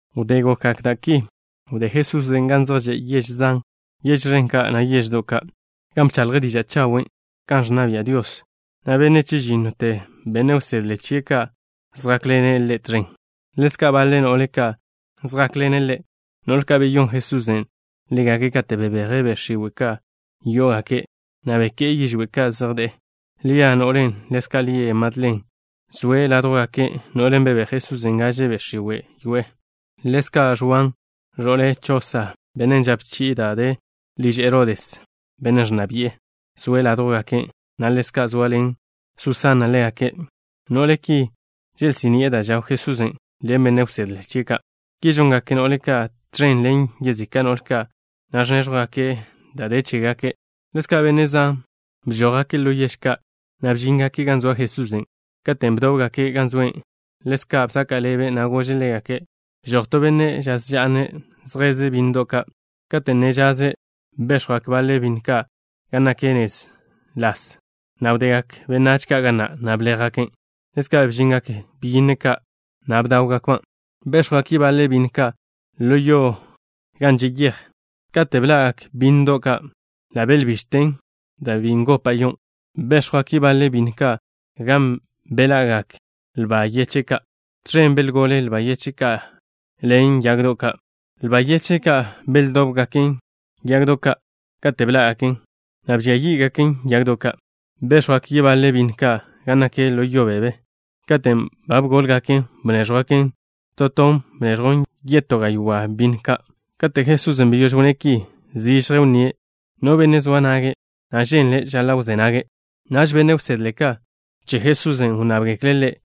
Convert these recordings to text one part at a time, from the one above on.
Wdé gokgak da' ki, wdé Jesusen' gan zej že' yež zan, yež ẕen ka', na' yeždo' ka', gan bchaḻje' diža' chawen' kan ẕnna bia' Dios, na' benne' chežínnote benne' wsedle chie' ka' zjákḻene' Ḻe' tẕen. Ḻezka' baḻe no'le ka' zjákḻene' Ḻe', no'le ka' beyón Jesusen' ḻégake' kate' bebeje' be' x̱iwe' ka' yó'ogake', na' beké'e yižwé' ka' zej de'e. Lia, no'len' ḻezka' lie' Madlen, zoe' ládjwgake', no'len' bebéj Jesusen' gaže be' x̱iwe' wyoé'e. Ḻezka' Ẕwan, ẕo'le Chosa, benne' žape chi'e da' de liž Herodes, benne' ẕnna bi'e, zoe' ládjwgake', na' ḻezka' zoaḻen Susana ḻégake'. No'le ki želsí'ni'e da' žaw Jesusen' ḻen benne' wsedle chie' ka'. Ki žongak no'le ka' tẕen ḻen yezika' no'le ka', na' ẕnéẕjwgake' da' de chégake'. Ḻezka' benne' zan bžójgake' ḻo yež ka', na' bžíngake' gan zoa Jesusen'. Katen' bdóbgake' gan zoe', Ḻe' bsaka' ḻebe', na' gože' ḻégake': —Bžoj to benne' žaz ža'ne' zjeze' bínnedo' ka'. Kate' ne zjeze', béx̱jwgak baḻe bínnedo' ka' gan nak nez las, na' wdegak benách ka' ga na', na' bléjgaken'. Ḻezka' bžingak byínnedo' ka', na' bdáwgakban'. Béx̱jwgak yebaḻe bínnedo' ka' ḻo yo gan že' yej. Kate' bḻa'gak bínnedo' ka', ḻa' belbižten dan' bi ngopa' yon'. Béx̱jwgak yebaḻe bínnedo' ka' gan beḻa'gak lba yeche' ka'. Tẕen belgole lba yeche' ka' ḻen yagdo' ka'. Lba yeche' ka' beldóbgaken yagdo' ka' kate' bḻá'gaken, na' bžia yí'gaken yagdo' ka'. Béx̱jwgak yebaḻe bínnedo' ka' gan nak ḻo yo beb. Katen' ba bgólgaken, bnéẕjwgaken. To ton bneẕjwn yetó gaywá' bínnedo' ka'. Kate' Jesusen' beyóž wnné' ki, zižje wnníe': —No benne' zoa nage', na' ženle', žaḻa' wzé nage'. Naž benne' wsedle ka' che Jesusen' wnnábgekle' Ḻe',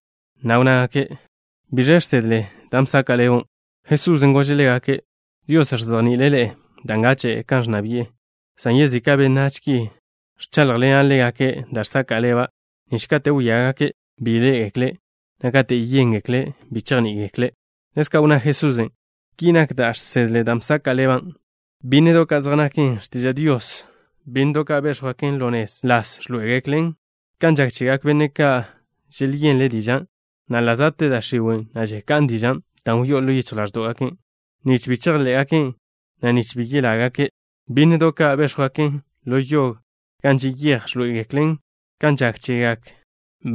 na' wnnágake': —¿Biẕ žsedle dan' bsaka' ḻebo'? Jesusen' gože' ḻégake': —Dios ẕzejni'ile' ḻe'e da' ngache' kan ẕnna bi'e Ḻe', san yezika' benách ki, ẕcháḻjḻena' ḻégake' da' žsaka' ḻeba' nich kate' wíagake', bi ḻé'egekle', na' kate' yéngekle', bi chejní'igekle'. Ḻezka' wnná Jesusen': —Ki nak da' žsedle dan' bsaka' ḻeba': Bínnedo' ka' zej naken x̱tiža' Dios. Bínnedo' ka' béx̱jwgaken ḻo nez las ẕḻoé'egeklen kan žak chegak benne' ka' želyenle' dižan', na' ḻa' za'te da' x̱iwe', na' žeká'n dižan' da' wyó'on ḻo yichj ḻáẕdo'gak benne' ka', nich bi chejḻé'gaken', na' nich bi yelágake'. Bínnedo' ka' béx̱jwgaken ḻo yo gan že' yej ẕḻoé'egeklen kan žak chegak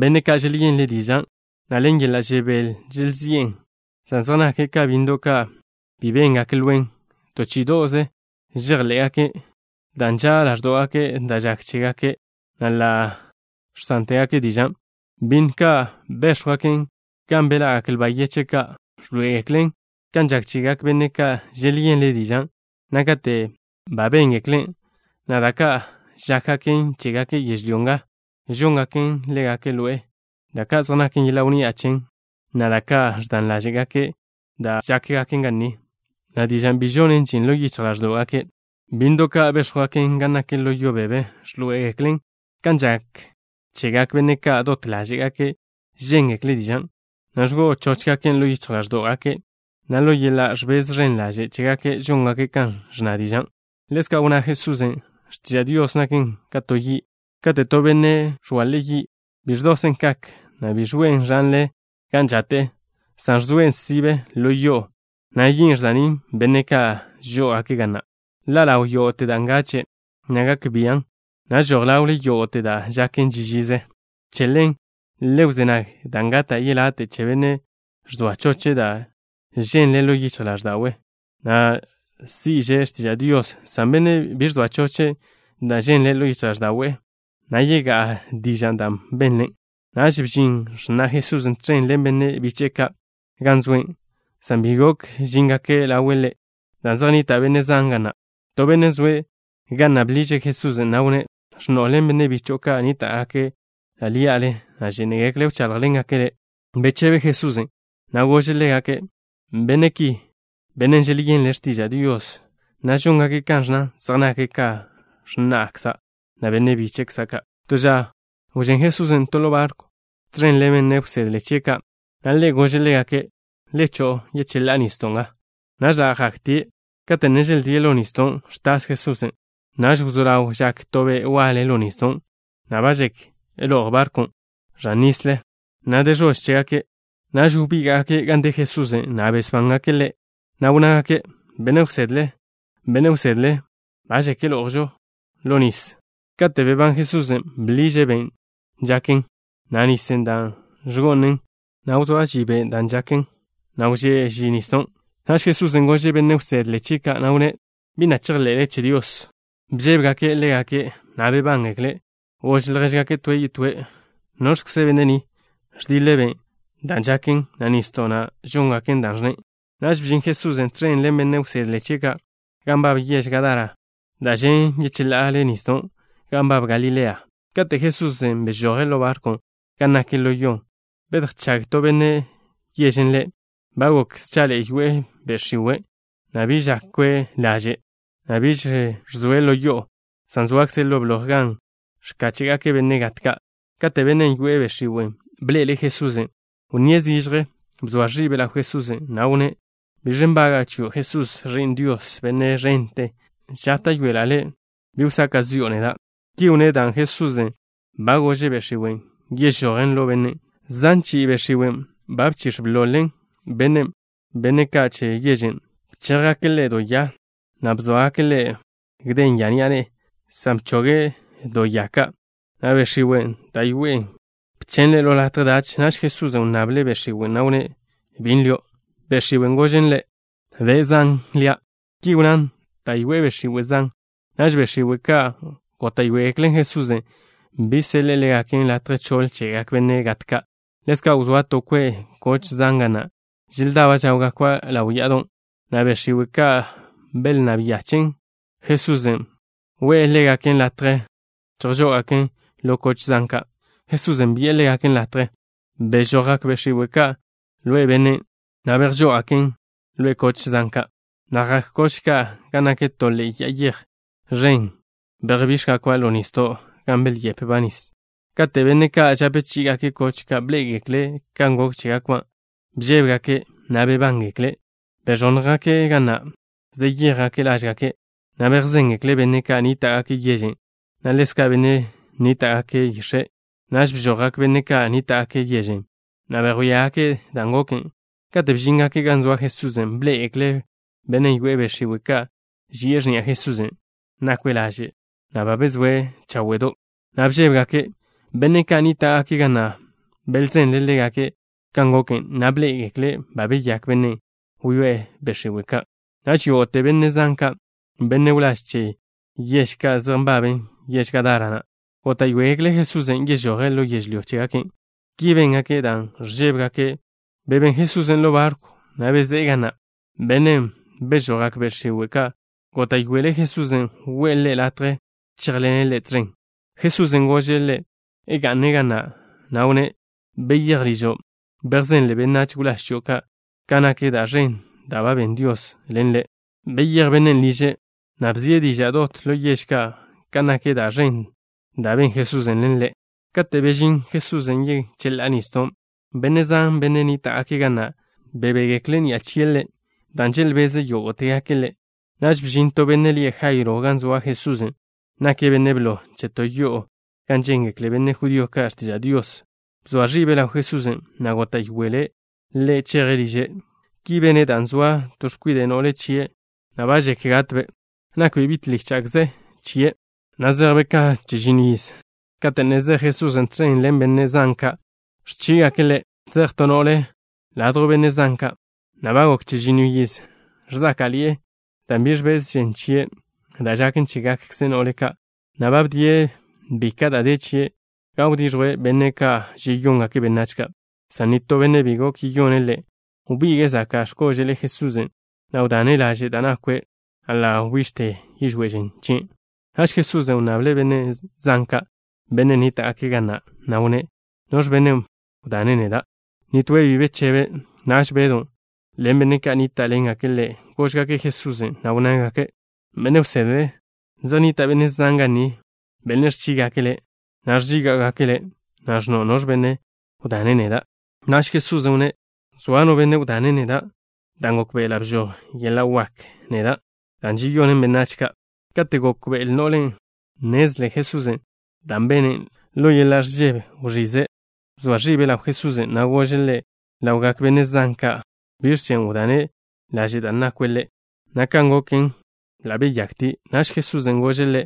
benne' ka' želyenle' dižan', na' ḻen yeḻa' žebél želzi'en, san zej nake' ka bínnedo' ka' bi béngaken lwen. To chí'ido'ze žejḻé'gaken', dan' nža' ḻáẕdogake' da' žak chégake', na' ḻa' žsántegake' dižan'. Bínnedo' ka' béx̱jwgaken gan beḻa'gak lba yeche' ka' ẕḻoé'egeklen kan žak chegak benne' ka' želyenle' dižan', na' kate' ba béngeklen', na' da' ka' žákgaken chégake' yežlyó nga žóngaken ḻégake' ḻo'e, da' ka' zej naken yeḻa' wnni'a chen, na' da' ka' ẕdan ḻáže'gake' da' žákgaken ga ni, na' dižan' bi žonen žin ḻo yichj ḻáẕdo'gake'. Bínnedo' ka' béx̱jwgaken gan nak ḻo yo beb ẕḻoé'egeklen kan žak chegak benne' ka' dot ḻáže'gake' žéngekle' dižan', na' ẕgo'o chóchgaken' ḻo yichj ḻáẕdo'gake', na' ḻo yeḻa' ẕbez ẕen ḻaže' chégake' žóngake' kan ẕnna dižan'. Ḻezka' wnná Jesusen': —X̱tiža' Dios naken ka to yi'. Kate' to benne' ẕgale' yi', bi ẕdosen' kak, na' bi ẕgo'en ẕanle gan žate'e, san ẕzoen' sibe ḻo yo'o, na' yin' žsa'nín' benne' ka' žó'ogake' ga na'. Ḻa' ḻaw yógo'te da' ngache', na' gak bian', na' žoj ḻawle yógo'te da' žaken ži žize. ’Che ḻen, le wzé nag, dan' gata' yelate' che benne' ẕzoa choche' da' ženle' ḻo yichj ḻáẕda'we', na' si'že' x̱tiža' Dios, san benne' bi ẕzoa choche' da' ženle' ḻo yichj ḻáẕda'we', na' yegá'a dižan' dan' benle'. Naž bžin x̱na' Jesusen' tẕen ḻen benne' biche'e ka', gan zoe', san bi gok žíngake' ḻawe' Ḻe' dan' zej nnita' benne' zan ga na'. To benne' zoe' ga na' bḻiže' Jesusen', na' wnné': —X̱no'o ḻen benne' bicho'o ka' nníta'gake' ḻí'ale, na' žénegekle' wcháḻjḻengake' Le'. Bechebe Jesusen', na' gože' ḻégake': —Benne' ki, benne' želyenle' x̱tiža' Dios, na' žóngake' kan ẕnnan zej nake' ka x̱na'kza', na' benne' bíche'kza' ka'. To ža wžén Jesusen' to ḻo barkw tẕen ḻen benne' wsedle chie' ka', na' Ḻe' gože' ḻégake': —Le cho'o yecheḻá'a nisdo' nga. Naž ḻa' zjaktie'. Kate' ne želdíe' ḻo nisdon', ẕtas Jesusen'. Naž wzó ḻaw žak to be' waḻe ḻo nisdon', na' ba žek yetj barkwn' ẕan nisle, na' de ẕož chégake'. Naž wbíga'gake' gan de Jesusen', na' besbángake' Ḻe', na' wnnágake': —¡Benne' wsedle! ¡Benne' wsedle! Ba žek ḻo'ojžo ẕan nisle. Kate' bebán Jesusen', bḻiže' ben' žaken, na' nisen' da' ẕgo'nen, na' wzóa ži ben' goken, na' wžé' ži nisdon'. Naž Jesusen' gože' benne' wsedle chie' ka', na' wnné': —¿Bi na' chejḻe'le che Dios? Bžébegake' ḻégake', na' bebángekle'. Gož ljéžgake' toe' yetóe': —¿Noẕkze benne' ni? Ẕdiḻe' be' dan' žaken, na' nisdo', na' žóngaken dan' ẕnne'. Naž bžin Jesusen' tẕen ḻen benne' wsedle chie' ka', gan nbab yež Gadara, da' žen' yecheḻa'ale nisdo' gan nbab Galilea. Kate' Jesusen' bežoje' ḻo barkwn' gan nak ḻo yon', bedjchág to benne' yežen' Ḻe'. Ba gok schaḻe'e yoe'e be' x̱iwe', na' biž žakwe' laže', na' biž ẕzoe' ḻo yo'o, san zoaze' ḻo bloj gan ẕkáche'gake' benne' gat ka'. Kate' bennen' yoe'e be' x̱iwe' bḻe'ele' Jesusen', wnníe' zižje. Bzoa ẕibe' ḻaw Jesusen', na' wnné': —¿Biẕ nbaga'a chio', Jesús, Ẕi'n Dios, Benne' ẕente? Žáta'yoela' Le' bi wsaka' zi'o neda'. Ki wnné' dan' Jesusen' ba gože' be' x̱iwen' yežojen ḻo bennen'. Zan chi'i be' x̱iwen' ba bchix̱ bḻol-ḻe'en bennen'. Benne' ka' che yežen' bchéjgake' ḻe' do ya, na' bzóagake' bayw ya ni'a ne'e, san bchoge' do ya ka', na' be' x̱iwen' da' yoe'e bchen' ḻe' ḻo latje dach. Naž Jesusen' wnnable' be' x̱iwen', na' wnné': —¿Bi lio'? Be' x̱iwen' gožen Ḻe': —Be' Zan lia'. Ki wnnán dan' yoe'e be' x̱iwe' zan. Naž be' x̱iwe' ka' góta'yoegeklen Jesusen' bi seḻe'e ḻégaken latje choḻ chegak benne' gat ka'. Ḻezka' wzóa to kwe' koch zan ga na', želdaba' žáwgakba' ḻaw ya'adon', na' be' x̱iwe' ka' belnnáb nyachen' Jesusen' we'e ḻégaken latje chejžó'ogaken ḻo koch zan ka'. Jesusen' bi'e ḻégaken latje. Bežojgak be' x̱iwe' ka' ḻo bennen', na' bejžó'ogaken ḻo koch zan ka', na' jak koch ka' gan nak to ḻe'e ya'a yej ẕen. Bejbíx̱jgakba' ḻo nisdo', gan belyepba' nis. Kate' benne' ka' žape chí'igake' koch ka', bḻé'egekle' kan gok chégakba', bžébegake', na' bebángekle'. Beẕónnjgake' ga na', zeyéjgake' lážgake', na' bejzéngekle' benne' ka' nníta'gake' yežen', na' ḻezka' benne' nníta'gake' yix̱en'. Naž bžojgak benne' ka' nníta'gake' yežen', na' bejwíagake' dan' goken. Katen' bžíngake' gan zoa Jesusen', bḻé'egekle' bennen' wyoé'e be' x̱iwe' ka', ži'e x̱ni'a Jesusen'. Nakwe' laže', na' ba bezóe' cháwe'do', na' bžébegake'. Benne' ka' nníta'gake' ga na' belzenle' ḻégake' kan goken, na' bḻé'egekle' ba beyák bennen' wyoé'e be' x̱iwe' ka'. Naž yógo'te benne' zan ka', benne' wláž che yež ka' zej nbaben yež Gadara na', góta'yoegekle' Jesusen' yežoje' ḻo yežlyó chégake'. Ki béngake' dan' ẕžébegake'. Bebén Jesusen' ḻo barkwn', na' bezé'e ga na'. Bennen' bežojgak be' x̱iwe' ka' ḻe' góta'yoele' Jesusen' we'e ḻe' latje chéjḻene' Ḻe' tẕen. Jesusen' gože' ḻe' ga'ne' ga na', na' wnné': —Beyéj ližo'. Bejzenle benách wláž chio' ka' ka nak da' ẕen da' ben Dios ḻen le'. Beyéj bennen' liže', na' bzie' diža' dot ḻo yež ka' kan nak da' ẕen da' ben Jesusen' ḻen ḻe'. Kate' bežín Jesusen' yecheḻá'a nisdon', benne' zan, benne' nníta'gake' ga na', bebégekle' ni'a chie' Ḻe' dan' želbeze' yógo'tegake' Ḻe'. Naž bžin to benne' lie' Jairo gan zoa Jesusen'. Nake' benne' blo che to yo'o gan žéngekle benne' judío ka' x̱tiža' Dios. Bzoa ẕibe' ḻaw Jesusen', na' góta'yoele' Ḻe' cheje' liže'. Ki bene' dan' zoa to x̱kwide' no'le chie', na' ba žek gatbe'. Nakbe' bi' tlícha'kze chie', na' zejbe' ka chežinno yiz. Kate' ne zej Jesusen' tẕen ḻen benne' zan ka', ẕchígake' Ḻe'. Zej to no'le ladjw benne' zan ka', na' ba gok chežinno yiz ẕzáka'ḻi'e, dan' bi ẕbez žen chie', da' žaken chégakkze no'le ka', na' ba bdie' bika' da' de chie', dan' wdiẕjwe' benne' ka' žeyóngake' benách ka', san nitó benne' bi gok yeyone' ḻe'. Wbige'e zaka' x̱kože'l Jesusen', na' wdane' laže' da' nakwe', na' ḻa' wbižte yižwé' žen chien'. Naž Jesusen' wnnable' benne' zan ka', benne' nníta'gake' ga na', na' wnné': —¿Noẕ benne' wdane' neda'? Nitóe' bi bechebe'. Naž Bedw ḻen benne' ka' nníta'ḻengake' ḻe', góžgake' Jesusen', na' wnnágake': —Benne' wsedle, zej nnita' benne' zan ga ni, benne' ẕchígake' Le', na' ẕžíga'gake' Le', na' ẕnno': “¿Noẕ benne' wdane' neda'?” Naž Jesusen' wnné': —Zoa no benne' wdane' neda', dan' gókbe'ela' bžoj yeḻa' wak neda', dan' žeyonen benách ka'. Kate' gokbe'el no'len' nnezle Jesusen' dan' bene', ḻo yeḻa' ẕžebe wẕize'. Bzoa ẕibe' ḻaw Jesusen', na' gože' Ḻe' ḻawgak benne' zan ka' biẕ chen' wdane' laže' da' nakwe' Ḻe', na' kan goken, ḻa' beyaktie'. Naž Jesusen' gože' ḻe':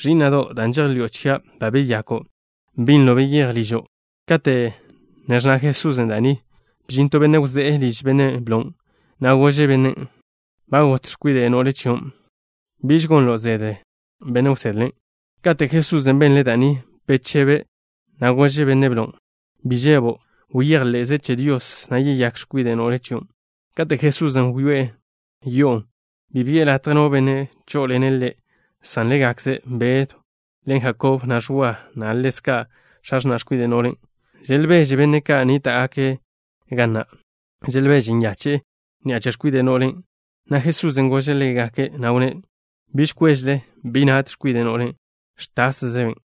—Ẕí'na'do', dan' žejḻi'o chia' ba beyako'. Binlo beyéj ližo'. Kate' ne ẕnna Jesusen' da' ni, bžin to benne' wzé'e liž benne' blon', na' gože' bennen': —Ba got x̱kwide' no'le chio'. Biž gon ḻelo' benne' wsedle. Kate' Jesusen' benle' da' ni, bechebe', na' gože' benne' blon': —Bi žebo'. Bejḻe'ze che Dios, na' yeyák x̱kwide' no'le chion'. Kate' Jesusen' wyoé'e yo'on', bi bi'e latje no benne' chó'oḻene' Ḻe' san ḻégakze Bedw ḻen Jakob, na' Ẕwa, na' ḻezka' x̱a x̱na' x̱kwide' no'len'. Želbeže benne' ka' nníta'gake' ga na'. Želbeže nyache'e ni'a che x̱kwide' no'len', na' Jesusen' gože' ḻégake', na' wnné': —Biž kwéžele. Bi nat x̱kwide' no'len'. Ẕtászebe'.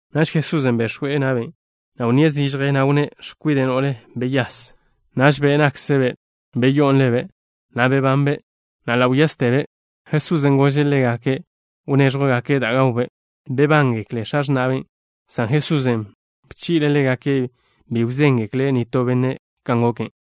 Naž Jesusen' bex̱we' na'be', na' wnníe' zižje, na' wnné': —X̱kwide' no'le, beyase. Naž be' nakkzbe' beyó'on ḻebe', na' bebanbe', na' ḻa' wyástebe'. Jesusen' gože' ḻégake' wnéẕjwgake' da' gawbe'. Bebángekle x̱a x̱na'be', san Jesusen' bchi'le' ḻégake' bi wzéngekle' nitó benne' kan goken.